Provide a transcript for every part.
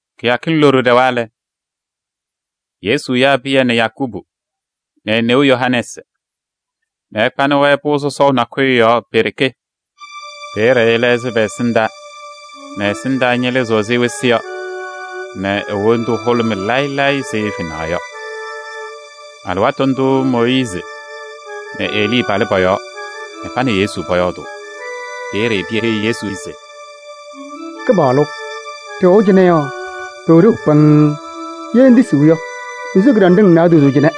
Kɩyakɩŋ loɖo ɖɛwa lɛ, Yesu yaa Pɩyɛ nɛ Yakubu nɛ e-neu Yohanɛɛsɩ nɛ ɛkpanɩ-wɛ pʋʋ sɔsɔʋ nakʋyʋ yɔɔ pe-ɖeke. Peeye ɛlɛɣzɩ pɛ-ɛsɩndaa nɛ ɛ-ɛsɩndaa ñɩlɩzɩɣ ɛzɩ wɩsɩ yɔ nɛ e-wondu hʋlʋmɩ layɩ layɩ ɛzɩ fenaɣ yɔ. Alɩwaatʋ ndʋʋ Mooyiizi nɛ Elii palɩ pɔ-yɔɔ nɛ pa nɛ Yesu pɔyɔɔdʋʋ. Peeye Pɩyɛ heyi Yesu se: “Kɩpaɣlʋ! Ɖɩwɛʋ cɩnɛ yɔ, pʋwɛ ɖeu pɩŋŋ. Ye ŋtisiɣ yɔ, mensiɣ kɩɖanɖɩŋ naadozo cɩnɛ: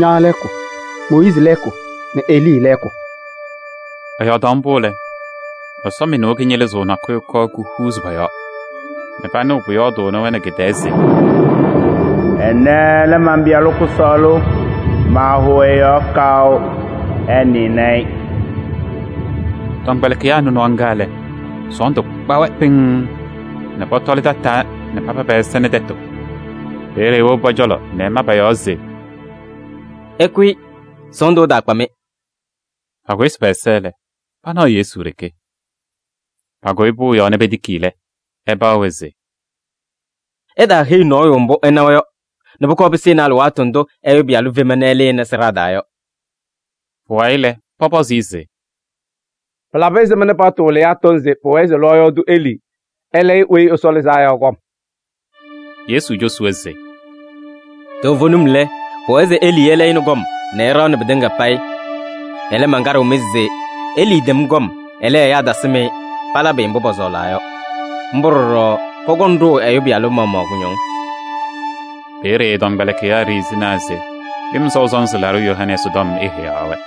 ña lɛɛkʋ, Mooyiizi lɛɛkʋ nɛ Elii lɛɛkʋ.” Ɛyɔɔdaɣ mbʋ lɛ, ɛsɔmɩnʋʋ kɩñɩlɩzʋʋ nakʋyʋ kɔɔ kuhuuzi pɔ-yɔɔ nɛ panɩɣ pʋyɔɔdʋʋnɩ-wɛ nɛ kɩ-tɛɛ se: “Ɛnɛ lɛ man-Pɩyalʋ kʋsɔɔlʋ, maahʋʋ ɛ-yɔɔ kaʋ. Ɩnɩnɩ-ɩ!” Tɔmkpɛlɩkɩyaa nɩ nɔɔ ŋga lɛ, sɔɔndʋ kpa-wɛ pɩŋŋ nɛ pɔtɔlɩ tataa nɛ papa pɛ-ɛza nɛ tɛtʋ. Peeye ewobi pɔ-cɔlɔ nɛ ɛma pɔ-yɔɔ se: “Ɩkʋyɩ, sɔɔndʋ ɛtaakpa-mɩ!” Pakʋsɩ pɛ-ɛza lɛ, panaɣ Yesu ɖeke. Pakʋyɩ pʋʋ yɔɔ nɛ petiki lɛ, ɛpaɣ-wɛ se: “Ɩtaaheyi nɔɔyʋ mbʋ ɩnawa yɔ nɛ pʋkɔɔ pɩsɩnɩ alɩwaatʋ ndʋ Ɛyʋ Pɩyalʋ fema nɛ ɛlɩnɩ sɩɖaa taa yɔ.” Pʋwayɩ lɛ, pɔpɔzɩ-ɩ se: “Pɩlabɩ ɛzɩma paɣtʋ wɩlɩyaa tɔŋ se pʋwɛɛ se lɔɔyaɣ tʋ Elii ɛlayɩ Weyi Ɛsɔ Lɩzaa Yɔ kɔm?” Yesu cosi-wɛ se: “Toovenim lɛ, pʋwɛɛ se Elii ɛlɛyɩnɩ kɔm nɛ ɛɖaɣnɩ pɩtɩŋa payɩ. Ɛlɛ, mankaɖɩɣ-mɩ se: Elii tɛm kɔm, ɛlɛ, ɛyaa tasɩm-ɩ, palabɩ-ɩ mbʋ pɔsɔɔlaa yɔ. Mbʋ ɖɔɖɔ pɔkɔŋ ɖʋʋ Ɛyʋ Pɩyalʋ maɣmaɣ kʋñɔŋ.” Peeye ɛ-tɔmkpɛlɩkɩyaa ɖiɣzinaa se Lɩm Sɔʋ Sɔnzɩ Laɖʋ Yohanɛɛsɩ tɔm eheyaɣ-wɛ.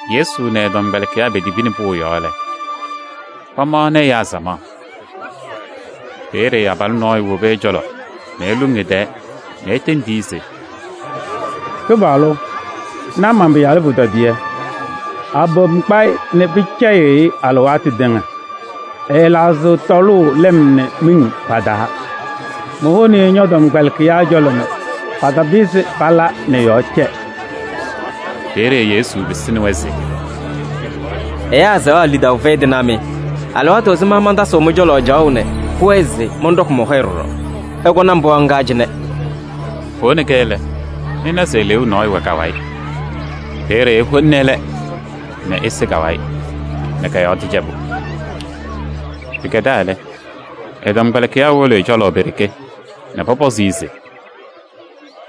Yesu nɛ ɛ-tɔmkpɛlɩkɩyaa petibini pʋʋ yɔɔ lɛ, pamaɣnɩ ɛyaa samaɣ. Peeye abalʋ nɔɔyʋ wobi ɛ-cɔlɔ nɛ eluŋ ɛ-tɛɛ nɛ etendi-i se: “Kɩpaɣlʋ! Na man-pɩyalʋ pʋtɔdɩyɛ. Abom kpa-ɩ nɛ pɩcɛyɩɣ-ɩ alɩwaatʋ tɩŋa. Ɛɛlaɣzɩɣ tɔlʋʋ lɩm nɛ miŋ pa-taa. Mowoni-i ñɔ-tɔmkpɛlɩkɩyaa cɔlɔ nɛ patapɩzɩ pala nɛ ɛ-yɔɔ cɛ.” Peeye Yesu pɩsɩnɩ-wɛ se: “Ɛyaa azaɣa lidaʋ fɛyɩ tɩnaa mɩ! Alɩwaatʋ ɛzɩma mantasɩɣ mɩ-cɔlɔ caɣʋ nɛ pʋwɛɛ se mɔnɖɔkɩ mɔ-hɔyɛ ɖɔɖɔ? Ɩkɔnɩ-m pɩɣa ŋga cɩnɛ!” Powoni-kɛ lɛ, ɛna se eleeu nɔɔyʋ wɛ ka-wayɩ. Peeye eholini ɛlɛ nɛ ese ka-wayɩ nɛ kɔ-yɔɔ tɩcɛbʋ. Pɩkɛdaa lɛ, ɛ-tɔmkpɛlɩkɩyaa wolo ɛ-cɔlɔ pe-ɖeke nɛ pɔpɔzɩ-ɩ se: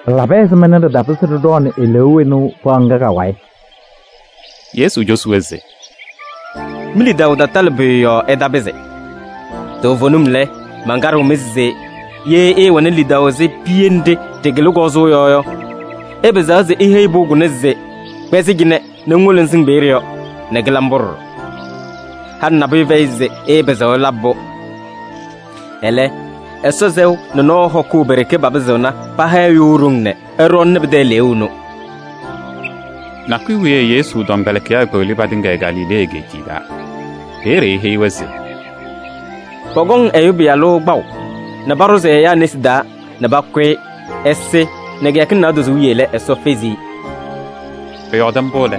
“Pɩlabɩ ɛzɩma nɛ ɖɩtapɩzɩ ɖɩɖɔɔnɩ eleeu ɛnʋ pɩɣa ŋga ka-wayɩ?” Yesu cosi-wɛ se: “Mi-lidaʋ tatalɩ pʋyʋ yɔɔ ɩtapɩzɩ. Toovenim lɛ, mankaɖɩɣ-mɩ se: ye ɩɩwɛnɩ lidaʋ ɛzɩ piye nɖɩ ɖɩkɩlɩ kɔzʋʋ yɔ yɔ, ɩpɩzaɣ se iheyi pʋʋ kʋnɛ se: ‘Kpɛzɩ cɩnɛ nɛ ŋwolo ŋsɩŋ peeye yɔ!’ Nɛ kɩla mbʋ ɖɔɖɔ. Halɩ nabʋyʋ fɛyɩ se ɩɩpɩzɩɣ ɩlabɩ-pʋ. [ Ɛlɛ, Ɛsɔ sɛʋ nɛ nɔɔ hɔkʋʋ pe-ɖeke papɩzɩɣna paha ɛyʋ ɖoŋ nɛ ɛɖɔɔnɩnɩ pɩtɛ eleeu ɛnʋ.]” Nakʋyʋ wiye Yesu tɔmkpɛlɩkɩyaa kpeɣli patɩŋa Galilee egeetiye taa. Peeye eheyi-wɛ se: “Pɔkɔŋ Ɛyʋ Pɩyalʋ kpaʋ nɛ paɖʋzɩ ɛyaa nesi taa nɛ pakʋ-ɩ ɛsɩ nɛ kɩyakɩŋ naadozo wiye lɛ, Ɛsɔ fezi-i.” Ɛyɔɔdɩ mbʋ lɛ,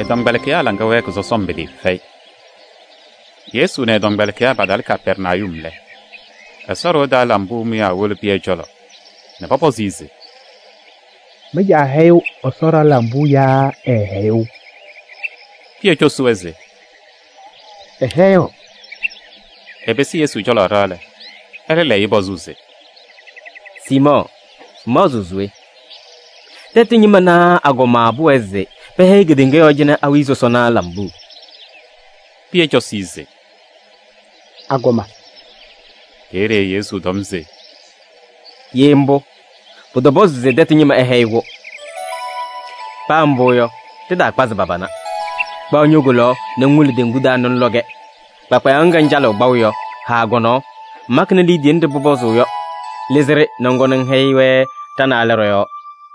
ɛ-tɔmkpɛlɩkɩyaa laŋa wɛɛkɩ sɔsɔm pɩtɩɩfɛyɩ. Yesu nɛ ɛ-tɔmkpɛlɩkɩyaa patalɩ Kapɛrnayum lɛ, Ɛsɔ ɖɩɣa taa lambuu mʋyaa wolo Pɩyɛ cɔlɔ nɛ pɔpɔzɩ-ɩ se: “Mɩ-caa hɛyɩɣ Ɛsɔ ɖɩɣa lambuu yaa ɛɛhɛyɩɣ?” Pɩyɛ cosi-wɛ se: “Ɛhɛyɩɣ.” Ɛpɩsɩ Yesu cɔlɔ ɖɩɣa lɛ, ɛlɛ lɛyɩ-ɩ pɔzʋʋ se: “Siimɔɔ! Ŋmaɣzɩɣ se we? Tɛtʋ ñɩma naa agɔma pʋwɛɛ se pɛhɛyɩ kedeŋa yɔɔ cɩnɛ awiya sɔsɔna lambuu?” Pɩyɛ cosi-i se: “Agɔma.” Peeye Yesu tɔm se: “Ye mbʋ, pʋtɔpɔzɩ se tɛtʋ ñɩma ɛhɛyɩ-kʋ. Paa mbʋ yɔ, ɖɩtaakpazɩ pa-pana. Kpaɣ ño-kolaɣ nɛ ŋwolo teŋgu taa nɛ ŋlɔ-kɛ. Kpakpayaɣ ŋga ŋcalɩɣ kpaʋ yɔ, haa kɔ-nɔɔ, ŋmakɩnɩ liidiye nɖɩ pʋpɔzʋʋ yɔ. Lɩzɩ-ɖɩ nɛ ŋkɔnɩ ŋhɛyɩ-wɛ ɖa-naalɛ ɖɔ-yɔɔ.”